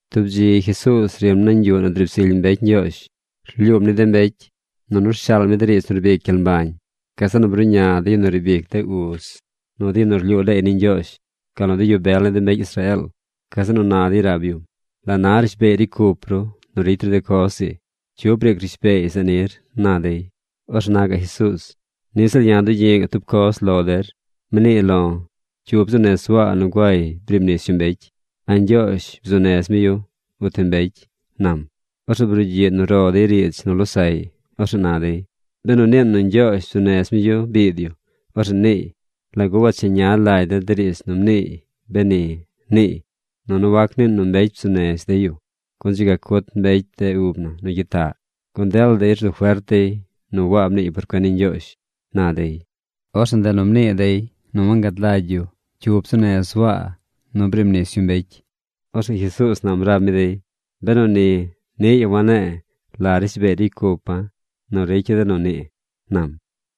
Tub dzi Jesuuz rim nañ yuꞌ nu driib zily mbecy Ñgyoozh. Rlyuum ni de mbecy nunu rshaal mi de riidz nu rbic gyel mbañ. Gazeꞌ nu bruꞌña de yu nu riib ic de uz, nu de yu nu rlyuu leey ni Ñgyoozh, gal nu de yu bel ni de mbecy Israeel. Gazeꞌ nu na dey rab yum: ―¿La na rishbeey ricy cup ru nu ricy ru de coz ii? ¿Cyu briic rishbeey zeꞌ nir? ―na dey. Orzeꞌ na gaꞌ Jesuuz: ―Niꞌ ziꞌl ya̱ dugyi̱ꞌ ga̱ꞌ tub coz lo der. Mnii lo̱: ¿Cyu bzuu nez Waa nu guay briib nis yu mbecy? ¿A Ñgyoozh bzuu nez mi yu, uti mbecy? ―nam. Orzeꞌ brugyiꞌ nu ro dey riidz nu losaꞌy. Orzeꞌ na dey: “Benu niin nu Ñgyoozh bzuu nez mi yu biid yu, orzeꞌ niiy: ¿Lagu wancheña lagy der de riidz nu mniiy, beni?, niiy. Nunu wac niin nu mbecy bzuu nez dey yu, gun dzi ga cut mbecy de ub na nu gyitaꞌ, gun dela dey rzu fert dey nu Waa mniiy por cuen ni Ñgyoozh”, na dey. Orzeꞌ ndeꞌ nu mnii dey nu wangad lagy dey cyu bzuu nez Waa nu griib nis yu mbecy. Orzeꞌ Jesuuz nam rab mi dey: ―Benu ni, niꞌ ya̱ wane̱e̱ la rishbeey ricy cupa̱ nu ricya̱ de nu nii ―nam.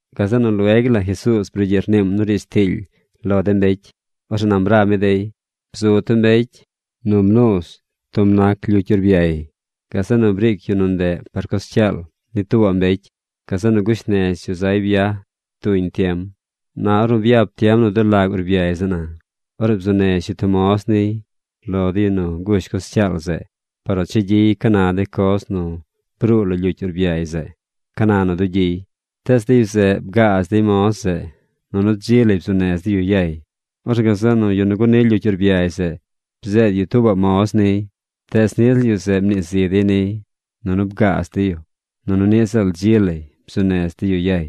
Gazeꞌ nu lueg la Jesuuz brugyiꞌ rniim nu riidz tiily lo de mbecy. Orzeꞌ nam rab mi dey: ―Bzu tub mbecy nu mnuuz tub nac lyucy urbyay. Gazeꞌ nu briic yu nu ndeꞌ par coz cyaal ni tuubaꞌ mbecy. Gazeꞌ nu gush nez yu zay byaj tuñ tiem. Na ornu byap tiem nu dulag urbyay zeꞌ na, orzeꞌ bzuu nez yu tub moz niy lo de yu nu gush coz cyaal zeꞌ par nu cha gyiy ca na de coz nu bruu lo de lyucy urbyay zeꞌ, ca na nu dugyiy. Tees de yu zeꞌ bgaaz dey moz zeꞌ nunu dzi lay bzuu nez dey yu yay. Orzeꞌ gazeꞌ nu yu nu guni lyucy urbyay zeꞌ bzeed yu tuubaꞌ moz niy. Tees niꞌ ziꞌl yu zeꞌ mnii zi dey niy, nunu bgaaz dey yu, nunu niꞌ ziꞌl dzi lay bzuu nez dey yu yay.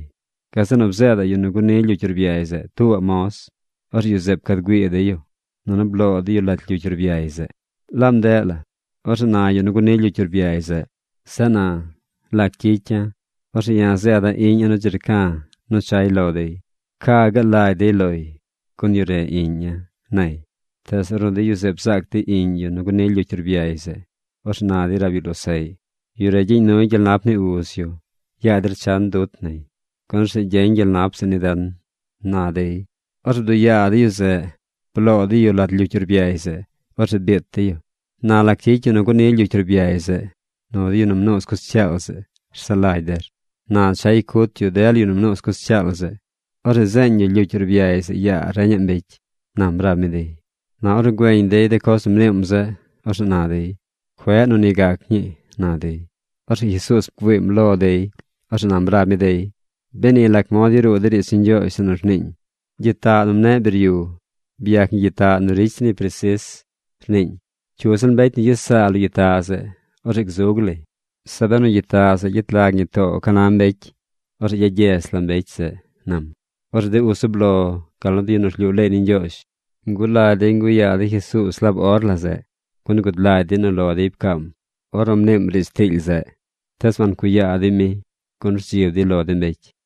Gazeꞌ nu bzeedaꞌ yu nu guni lyucy urbyay zeꞌ tuubaꞌ moz. Orzeꞌ yu zeꞌ pcad güii dey yu, nunu bloo dey yu lat lyucy urbyay zeꞌ. ’Laab ndeꞌ la, orzeꞌ na yu nu guni lyucy urbyay zeꞌ: “Zeꞌ na, ¿lac gyicya̱? Orzeꞌ ya̱ zeeda̱ iꞌña̱ nu dzi rca̱ nu chay lo dey. Ca gaal lagy dey loy, gun yu re iꞌña̱”, nay. Tees ornu de yu zeꞌ bzaac dey iꞌñ yu nu guni lyucy urbyay zeꞌ, orzeꞌ na dey rab yu losaꞌy: “Yu re gyeñ nuy gyel nap ni uz yu. Yaa der chan dut nay, gun orzeꞌ gyeñ gyel nap zeꞌ ni den”, na dey. Orzeꞌ bduꞌ yaa dey yu zeꞌ. Bloo dey yu lat lyucy urbyay zeꞌ. Orzeꞌ biit dey yu. ’¿Na lac gyicy yu nu guni lyucy urbyay zeꞌ nu de yu nu mnuuz coz cyaal zeꞌ rsaꞌ lagy der? Na chay cut yu dela yu nu mnuuz coz cyaal zeꞌ. Orzeꞌ zeeñ yu lyucy urbyay zeꞌ yaa reñaꞌ mbecy ―nam rab mi dey. Na ornu güeñ dey de coz nu mniim zeꞌ, orzeꞌ na dey: ―¡Cueꞌ nu ni gac ñii! ―na dey. Orzeꞌ Jesuuz bgüiim lo dey. Orzeꞌ nam rab mi dey: ―Beni lac mod yaruu de riidz ni Ñgyoozh zeꞌ nu rniiñ: Gyitaꞌ nu mneꞌ biryu, byac ñi gyitaꞌ nu ricy zir ñi presis rniiñ. Cyu ziꞌl mbecy nu gyes saa lo gyitaꞌ zeꞌ, orzeꞌ gzug lay. Zeꞌ benu gyitaꞌ zeꞌ gyet lag ñi too ca na mbecy, orzeꞌ gyagyez la mbecy zeꞌ ―nam. Orzeꞌ de uz zub lo gal nu de yu nu rlyuu leey ni Ñgyoozh ngulagy dey nguꞌ yaa dey Jesuuz laab or la zeꞌ, gun gud lagy dey nu lo dey pcaam ornu mniim riidz tiily zeꞌ. Tees wancuꞌ yaa dey mi, gun rdzib dey lo de mbecy.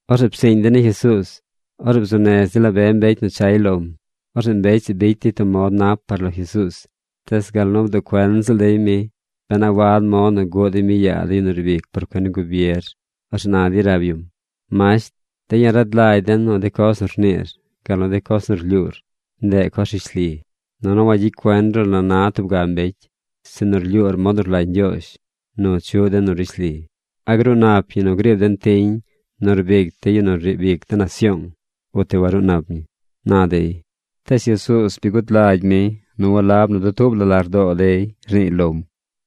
Orzeꞌ psiiñ dey ni Jesuuz. Orzeꞌ bzuu nez dey la be mbecy nu chay lom. Orzeꞌ mbecy zeꞌ bicy dey tub mod nap par lo Jesuuz, tees gal nu bduꞌ cuen ziꞌl dey mi ben a wad mod nu guꞌ dey mi yaa de yu nu riib ic por cuen ni gubier. Orzeꞌ na dey rab yum: ―Masht, de̱ ya̱ rad lagy de̱ nu de coz nu rniir gal nu de coz nu rlyuur, ndeꞌ coz rishli, nunu wagyicy cuen ru la na tub ga mbecy, sinu rlyuur mod nu rlagy Ñgyoozh nu chuꞌ den nu rishli. ¿A gruu nap ñi nu griib den tiñ nu rbic dey ni yu nu riib ic de nasyoong, uti waruu nap ñi? ―na dey. Tees Jesuuz bi gud lagy mi nu walab nu dutuub la lardoo dey rniiy lom.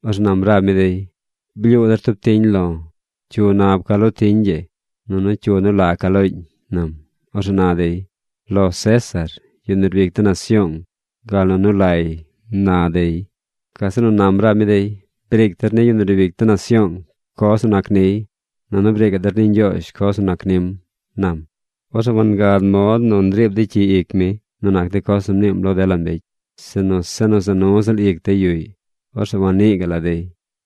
Orzeꞌ nam rab mi dey: ―Blyuu der tub tiñ lo̱. ¿Cyu nab ca lo tiñ ii? Nunu ¿cyu nu la ca looñ? ―nam. Orzeꞌ na dey: ―Lo César, yu nu riib ic de nasyoong, gal nu nu lay ―na dey. Gazeꞌ nu nam rab mi dey: ―Briic der ni yu nu riib ic de nasyoong coz nu nac niy. Nunu briicaꞌ der ni Ñgyoozh coz nu nac nim ―nam. Orzeꞌ wangad mod nu riib dey cyi ic mi nu nac de coz nu mniim lo dela mbecy, sinu se za nu ziꞌl ic dey yuꞌy. Orzeꞌ wannii gaꞌ la dey.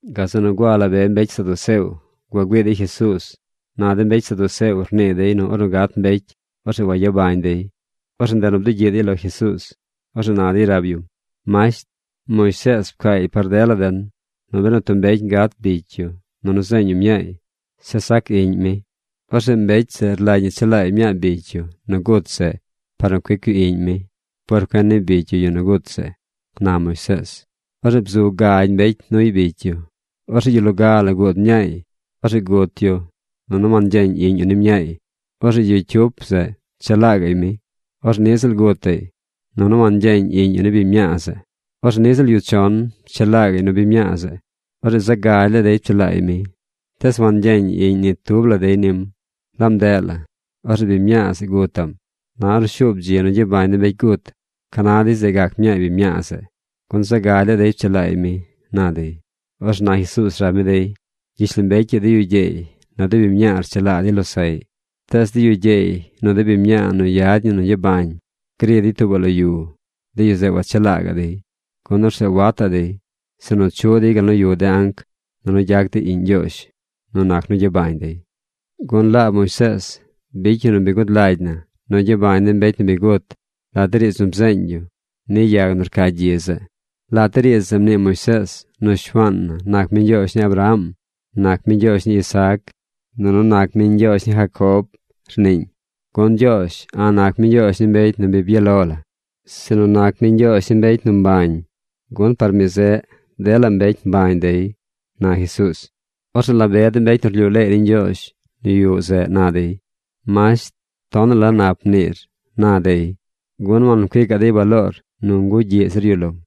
Gazeꞌ nu gua la be mbecy saduceo gua güii dey Jesuuz. Na de mbecy saduceo rnii dey nu ornu gat mbecy, orzeꞌ wayabañ dey. Orzeꞌ ndeꞌ nu bdugyiꞌ dey lo Jesuuz. Orzeꞌ na dey rab yum: ―Masht, Moisees pcaay par dela den nu benu tub mbecy gat bicy yu, nunu zeeñ yu mñaay, zeꞌ sac iꞌñ mi, orzeꞌ mbecy zeꞌ rlagy ñi chelaay mñaa bicy yu nu gut zeꞌ par nu cuic yu iꞌñ mi por cuen ni bicy yu yu nu gut zeꞌ, na Moisees. Orzeꞌ bzu gagy mbecy nuy bicy yu. Orzeꞌ yu loga la guud mñaay. Orzeꞌ gut yu nunu wangyeeñ iꞌñ yu ni mñaay. Orzeꞌ yu cyup zeꞌ pchelaa gaꞌy mi. Orzeꞌ niꞌ ziꞌl gutaꞌy, nunu wangyeeñ iꞌñ yu ni biñ mñaa zeꞌ. Orzeꞌ niꞌ ziꞌl yu chon pchelaa gaꞌy nu biñ mñaa zeꞌ. Orzeꞌ zaꞌ gagy laa dey pchelaay mi. Tees wangyeeñ iꞌñ ni tub la dey nim. Laab ndeꞌ la, orzeꞌ biñ mñaa zeꞌ gutaꞌm. Na ornu shuub dzi nu gyabañ de mbecy gut, ¿ca na dey zeꞌ gac mñaay biñ mñaa zeꞌ? Gun zaꞌ gagy laa dey pchelaay mi ―na dey. Orzeꞌ na Jesuuz rab mi dey: ―Gyishlombecy ii de yu gyeey, nu de biñ mñaa rchelaa dey losaꞌy. Tees de yu gyeey nu de biñ mñaa nu yad ñi nu gyabañ gri dey tuubaꞌ lo yu, de yu zeꞌ wachelaa gaꞌ dey. Gun orzeꞌ wataꞌ dey, sinu chuꞌ dey gal nu yuꞌ de anc, nunu gyac dey iꞌñ Ñgyoozh nu nac nu gyabañ dey. Gun laab Moisees bicy yu nu bi gud lagy na nu gyabañ de mbecy nu bi gut lat de riidz nu bzeeñ yu ni yag nu rca gyi zeꞌ. Lat de riidz zeꞌ mnii Moisees nu Shuaan na nac mi Ñgyoozh ni Abraham, nac mi Ñgyoozh ni Isaac, nunu nac mi Ñgyoozh ni Jacob, rniiñ. Gun Ñgyoozh a̱ꞌ nac mi Ñgyoozh ni mbecy nu bi byaꞌ lo la, sinu nac mi Ñgyoozh ni mbecy nu gabee zu, gun par mi zeꞌ dela mbecy gabee zu dey ―na Jesuuz. Orzeꞌ la be de mbecy nu rlyuu leey ni Ñgyoozh nu yuꞌ zeꞌ na dey: ―Masht, tonaꞌ la nap mniir ―na dey. Gun wancuicaꞌ dey baloor nu ngugyiꞌ zir yu lom.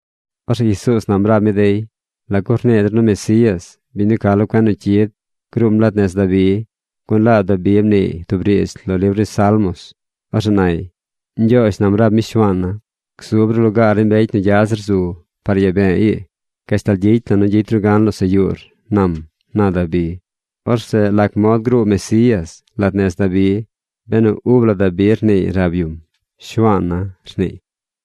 Orzeꞌ Jesuuz nam rab mi dey: ―¿Lagu rnii dey nu Mesías, biñ nu ca lo cuen nu cyid, gruum lat nez Dabi? Gun laab Dabi mniiy tub riidz lo libr ni Salmos. Orzeꞌ nay: Ñgyoozh nam rab mi Shuaana̱, Gzub ru lugaar ni mbecy nu gya zir zu, par yaa be̱e̱ ii, Gashtal gyicy la̱ nu gyicy ru gan losaꞌ yuur, nam, na Dabi. Orzeꞌ ¿lac mod gruu Mesías lat nez Dabi, benu ub la Dabi rniiy rab yum: “Shuaana̱”, rniiy?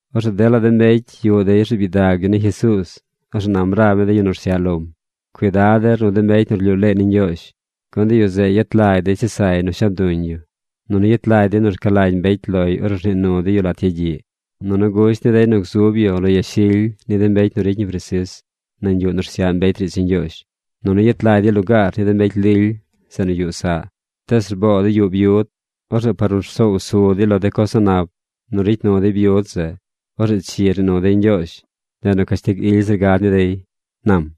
Orzeꞌ dela de mbecy yuꞌ dey rzuub gyidag yu ni Jesuuz. Orzeꞌ nam rab mi de yu nu rsyaꞌ lom: ―Cuidad der nu de mbecy nu rlyuu leey ni Ñgyoozh. Gun de yu zeꞌ yet lagy dey chesay nu shab duñ yu, nunu yet lagy dey nu rca lagy mbecy loy ornu rnii nu dey yu lat yagyiꞌ. Nunu gusht ni dey nu gzub yu lo yashily ni de mbecy nu ricy ñi presis nañ yuꞌ nu rsyaꞌ mbecy riidz ni Ñgyoozh. Nunu yet lagy dey lugaar ni de mbecy lily zeꞌ nu yuꞌ saꞌ. Tees rboo dey yuꞌ byud. Orzeꞌ par nu rsoow su dey lo de coz a̱ꞌ nap nu ricy nu dey byud zeꞌ, orzeꞌ chi rnii nu dey Ñgyoozh. Ndeꞌ nu cashtig ily zir gad ni dey ―nam.